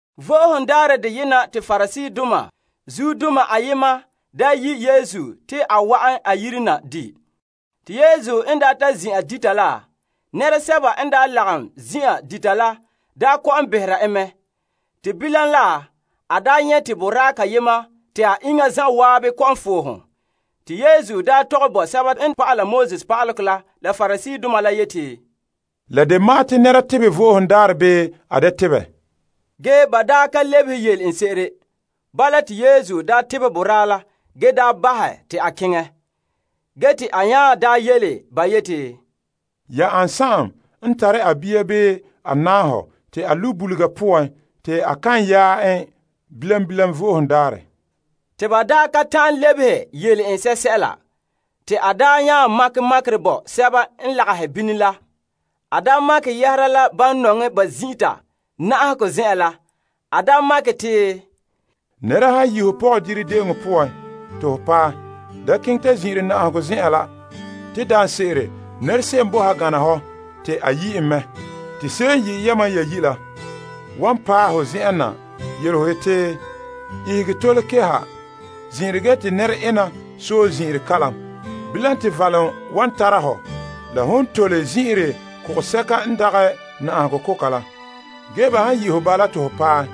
Vo'ohogo Daarɛ deyena te Pariseedoma zuodoma ayema daa yi' Yesu te a wa'an a yire na di'. Te Yesu n ta zin'an dita la, nɛresɛba n lagom zin'an dita la kɔ'ɔn behera en mɛ. Te bilam la, a nyɛ' te boraa kayema te a iŋa zan'an kɔ'ɔn fohom. Te Yesu tɔgɛ bo pa'alegɔ pa'aleba la la Pariseedoma la te, La de ma'an te nɛra tebɛ Vo'ohogo Daarɛ bii a da tebɛ? Ge ba ka lebehe yele en se'ere. Bala te Yesu tebɛ boraa la ge bahɛ te a keŋɛ. Ge te a nya yele ba yeti, Ya ane n tare a bia bii a nahɔ te a lu' bulega poan te a kan yaɛ en bilam bilam Vo'ohogo Daarɛ? Te ba ka ta'an lebehe yele en sɛla. Te a daa nya makɛ makerɛ bo sɛba n lagahɛ bini la. A makɛ yɛhera la ban nɔŋɛ ba zin'ita na'ahegɔ zen'en la. A makɛ te, Nɛra han yi' ho pɔgɔdire de'eŋɔ poan te ho paɛ, da keŋɛ ta zin'ire na'ahegɔ zen'an la. Te daanse'ere nɛra se'em boe ha gana hɔ te a yi' en me. Te se'em n yi' yamam ya yi' la wan paɛ ho zen'en na yele ho te, ihege tole keha zin'ire ge te nɛre'ena sɔe zin'ire kalam. Bilam te valom wan tara hɔ la ho tole zin'ire kogosɛka n dagɛ na'ahegɔ koka. Ge ba han yi' ho bala te ho paɛ,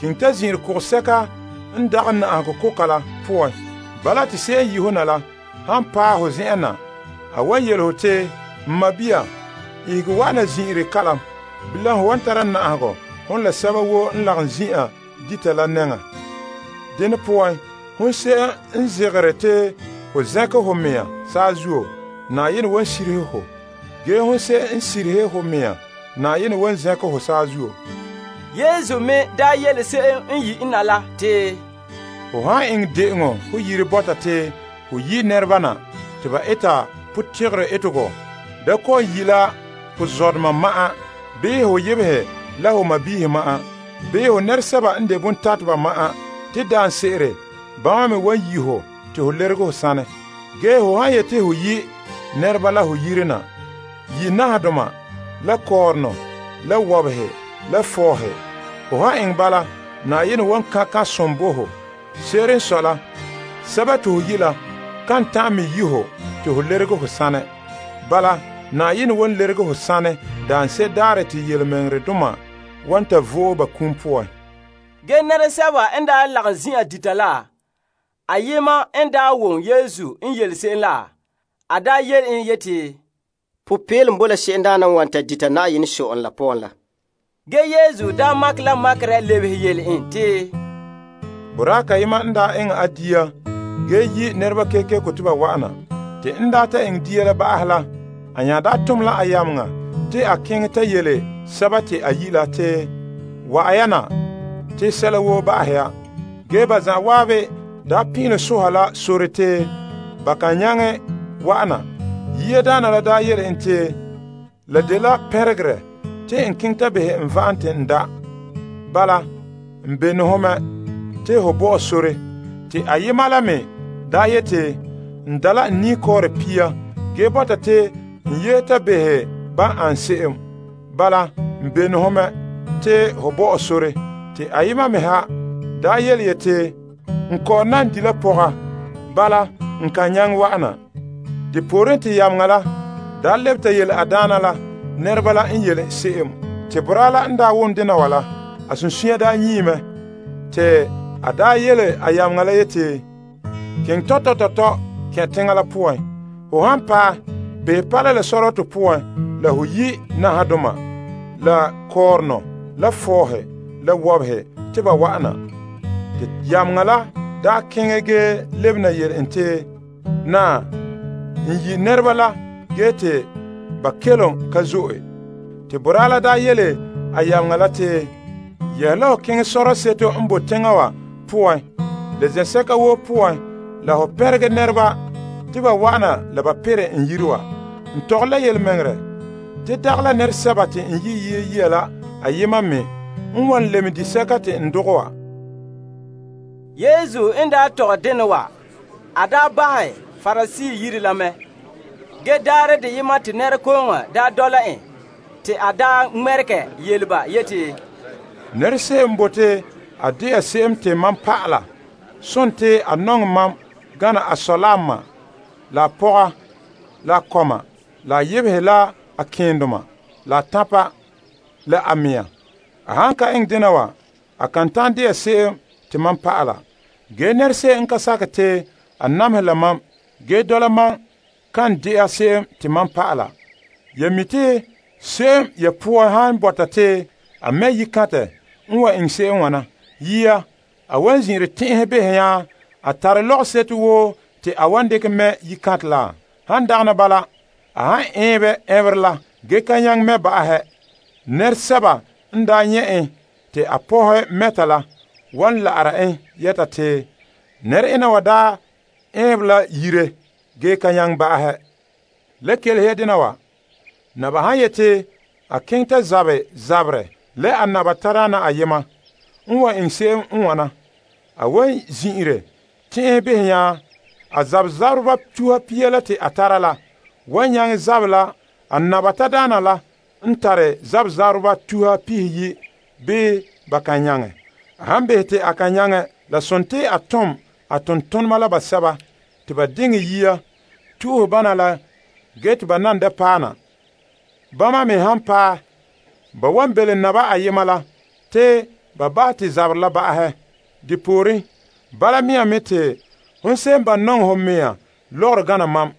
keŋɛ ta zin'ire kogosɛka n dagɛ na'ahegɔ koka la poan. Bala te se'em n yi' ho na la han paɛ ho zen'en na, a wan yele ho te, n sɔɔn, ihege wa'ana zin'ire kalam. Bilam ho wan tara na'ahegɔ hon la sɛba woo n lagom zin'an dita la nɛŋa. Dene poan, hon se'em n zegere te ho zɛnkɛ ho mɛŋa saazuo, Na'ayenɛ wan sirihe ho. Ge hon se'em n sirihe ho mea, Na'ayenɛ wan zɛnkɛ ho saazuo. Yesu me yele se'em n yi' en na la te, Ho han eŋɛ de'eŋɔ ho yire bɔta te ho yi' nɛreba na te ba eta potegere etegɔ da kɔ'ɔn yi' la ho zɔdoma ma'an bii ho yebehe la ho sɔɔnrɔ ma'an, bii ho nɛresɛba n de bontateba ma'an. Te daanse'ere bama me wan yi' ho te ho lerege ho saanɛ. Ge ho han yeti ho yi' nɛreba la ho yire na, yi' nahadoma la kɔɔrɔnɔ la wɔbehe la fɔɔhe. Ho han eŋɛ bala, Na'ayenɛ wan kan' kan'somɔ bo ho. Se'ere n sɔe la, sɛba te ho yi' la kan ta'an me yi' ho te ho lerege ho saanɛ. Bala, Na'ayenɛ wan lerege ho saanɛ daanse'ere daarɛ te tontɔɔdoma wan ta vo'e ba kum poan. Ge nɛresɛba n lagom zin'an dita la, ayema n wom Yesu n yele se'em la a yele en yeti, Popeelom bo la se'emdaana n wan ta dita Na'ayenɛ Sɔ'ɔlom la poan la. Ge Yesu makɛ la makerɛ lebehe yele en te, Boraa kayema n daa ta eŋɛ a dia ge yi' nɛreba kekeko te ba wa'ana. Te n ta eŋɛ dia la ba'ahɛ la, a nya tom la a yameŋa te a keŋɛ ta yele sɛba te a yi' la te, wa'an ya na, te sɛla woo ba'ahɛ ya. Ge ba zan'an pin'ilom soha la sore te ba kan nyaŋɛ wa'ana. Yiadaana la yele en te, la dela pɛnregerɛ te n keŋɛ ta behɛ n va'am te n da'. Bala, n bene ho mɛ te ho bo mam sore. Te ayema la me yeti, n da' la n niikɔɔre pia ge bɔta te n yehe ta behɛ ban an se'em. Bala, n bene ho mɛ to ho bo mam sore. Te ayema me ha yeti, n kɔ'ɔn na di' la pɔga. Bala, n kan nyaŋɛ wa'ana. Depooren te yameŋa la lebe ta yele a daana la nɛreba la n yele se'em. Te boraa la n wom dena wa la, a sunsunya nyie mɛ te a yele a yameŋa la yeti, Keŋɛ tɔtɔ tɔtɔ la kɛn' teŋa la poan. Ho han paɛ, behɛ paala la sɔrɔtɔ poan la ho yi' nahadoma la kɔɔrɔnɔ la fɔɔhe la wɔbehe te ba wa'ana. Te yameŋa la daa keŋɛ ge lebena yele en te, Naa, n yi' nɛreba la ge te ba kelom ka zo'e. Te boraa la daa yele a yameŋa la te, Yehe la ho keŋɛ sɔrɔɔ seto n boe teŋa poan la zen'sɛka woo poan la ho tɔgɛ ninmɔ'ɔrɛ bo nɛreba te ba wa'ana la ba perɛ n yire wa. N tɔgɔre la yelemɛŋɛrɛ, te dagɛ la nɛresɛba te n yi' yia la ayena me a wan lɛm disɛka te n dogɛ wa. Yesu n tɔgɛ dena wa, a bahɛ Parisee yire la mɛ. Ge daarɛ deyema te nɛrekooŋɔ dɔla en te a ŋmɛregɛ yele ba yeti, Nɛra se'em n bote a de'a se'em te mam dɔla sontii a nɔŋɛ mam gana a sɔ la a ma la a pɔga la a kɔma la a yebehe la a keendoma, la a tanpa, ge la a mɛŋa. A han ka eŋɛ dena wa, a kan ta'an de'a se'em te mam dɔla. Ge nɛra se'em n ka sakɛ te a namehɛ ta ki' mam zuo kan dɛna mam dɔla. Ya mi' te se'em ya poan han bɔta te a mɛ' yikantɛ n wan eŋɛ se'em n wana: yia, a wan zin'ire tɛn'ɛhɛ behɛ nya a tare lɔgɔseto woo te a wan dekɛ mɛ' yikantɛ la. Han dagana bala, a han ɛɛnbɛ ɛnberɛ la ge ka nyaŋɛ mɛ' ba'ahɛ, nɛresɛba n daa nyɛ' en te a pɔhɛ mɛta la wan la'ara en yɛta te, nɛre'ena wa ɛɛnbɛ la yire ge ka nyaŋɛ ba'ahɛ. Le kelehe ya dena wa. Naba han yete a keŋɛ ta zabɛ zaberɛ la a naba tadaana ayema n wan eŋɛ se'em n wana: a wan zin'ire tɛn'ɛhɛ behɛ nya a pɛɛntɛɛnreba tuha pia la te a tara la wan nyaŋɛ zabɛ la a naba tadaana la n tare pɛɛntɛɛnreba tuha pihiyi' bii ba kan nyaŋɛ. A han behɛ te a kan nyaŋɛ, a tom la nɛrezura te ba diŋɛ yia to'ohɛ bana la ge te ba nan paɛ na. Bama me han paɛ, ba wan belom naba ayema la te ba bahɛ te zaberɛ la ba'ahɛ. Depooren, bala mea me te hon se'em n ba' nɔŋɛ ho mea lɔgɔrɔ gana mam,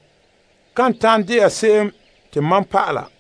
kan ta'an de'a se'em te mam dɔla.